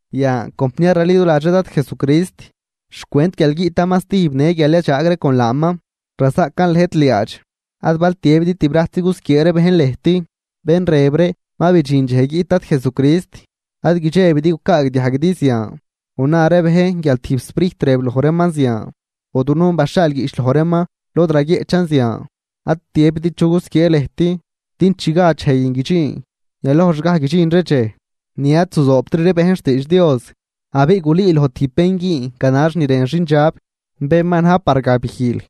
Yan, compniar raliduladx ree Dad Jesucrist, xcwent guial guiꞌtaman stijb në guial yadxaag ree con laaman, razaꞌcan lëjt liaadx, ad bal tiëbidi tibrajtzi gusquiee ree bejn lëjt, bén rëb ree ma bidxin dxej guiꞌt Dad Jesucrist. Ad guidxebidi gucaagdiajguidi zian, o na ree bejn guial tijb sprijt rëb loj reeman zian, o dunujn baxhaal guiꞌch loj reeman lod raguieꞌchan zian. Ad tiëbidi chu gusquiee lëjt, din chi gad dxej guin guidxin, yalojxgaj guidxin ree dxej ni ad zuzoobtri bejn xtiidx Dios. Abiꞌ gulüüloj tijb bén güün ganax ni rën xindxab, bén ma na̱j par gabijl.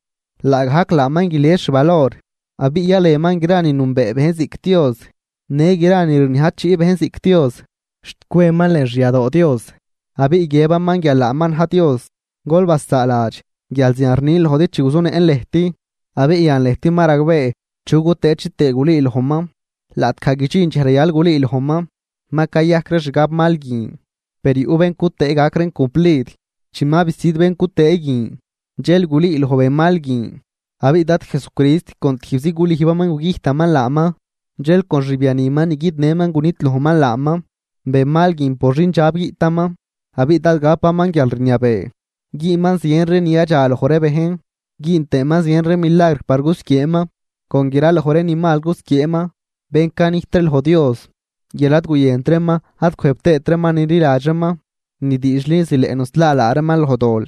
Laagajc laaman guilies xvalor, abiꞌ yalenman gra ni nünbee bejn ziꞌc Dios në gra ni rniajchiꞌ bejn ziꞌc dios, xt cweman lën xyadoo Dios, abiꞌ guiëbaman guial laaman na̱j Dios. Gol basaaladx guial zian rnin lojdi chi guzunëꞌn lëjt. Abiꞌ yan lëjt ma ragbee chu cutëë chitëë gulüülojman, laꞌtgaj guidxin dxej rayal gulüülojman. Ma cayajc ree xgabmal guin, per yuꞌ bén cutëë gac reen cumplid. Chi ma bisüd bén cutëë guin, dxel gulüüloj benmal guin, abiꞌ Dad Jesucrist con tijbzi gulüjbaman gugüjtaman laaman, dxel con xbianiman ni guidnëman gunidlojman laaman. Benmal guin por xindxab guiꞌtaman, abiꞌ dád gapaman guialrniabee. Güünman zien ree ni yadxaloj ree bejn, güün tëëman zien ree milagr par gusquieeman. Con graloj ree ni mal gusquieeman bén canijt ree loj Dios, guial ad guyënt reeman ad cwëjb tëët reeman nililadx reeman ni diidxli zileꞌ nuslaa laa reeman loj dol.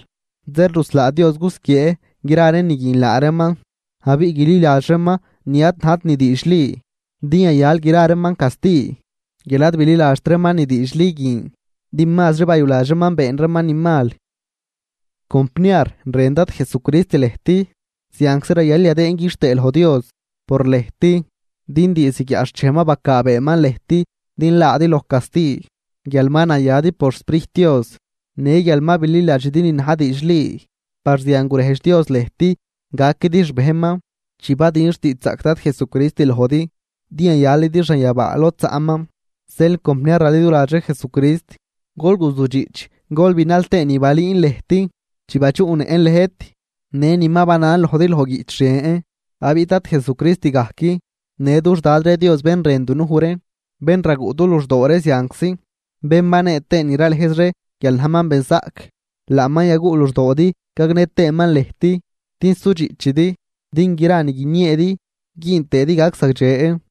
Zeel ruslaa Dios gusquiee gra ree ni guin laa reeman, abiꞌ guililadx reeman ni ad najt ni diidxli, din yayal gra reeman casti, guial ad bililadxt reeman ni diidxli guin, din mazri bayuladx reeman been reeman ni mal. Compniar, rën Dad Jesucrist lëjt. Zianczi rayal yadëën quixtëë loj Dios por lëjt, din diizd guiaꞌxchej ma bacaabeeman lëjt din laadi loj casti, guial ma nayadi por xSprijt Dios në guial ma bililadxidi ni na̱j diidxli. Par zian gurejdx Dios lëjt gaquidi xbejnman chi badün xtiidxzaꞌc Dad Jesucrist lojdi, din yayalidi xanyabaa lod zaꞌman. Zeel, compniar raliduladx ree Jesucrist, gol guzujdxiꞌch gol binal tëë ni balüün lëjt chi badxuꞌnëꞌn lëjt, në ni ma banan lojdi loj guiꞌch ren. Abiꞌ Dad Jesucrist gajc në dux Dad ree Dios bén rën dunuj ree, bén raguꞌ du luxdoo ree zianczi, bén banee tëë ni ralëjz ree guial najman benzaꞌc, laaman yaguꞌ luxdoodi gagnë tëëman lëjt din sudxiꞌchidi din gra ni guinieedi güün tëëdi gac zagdxe.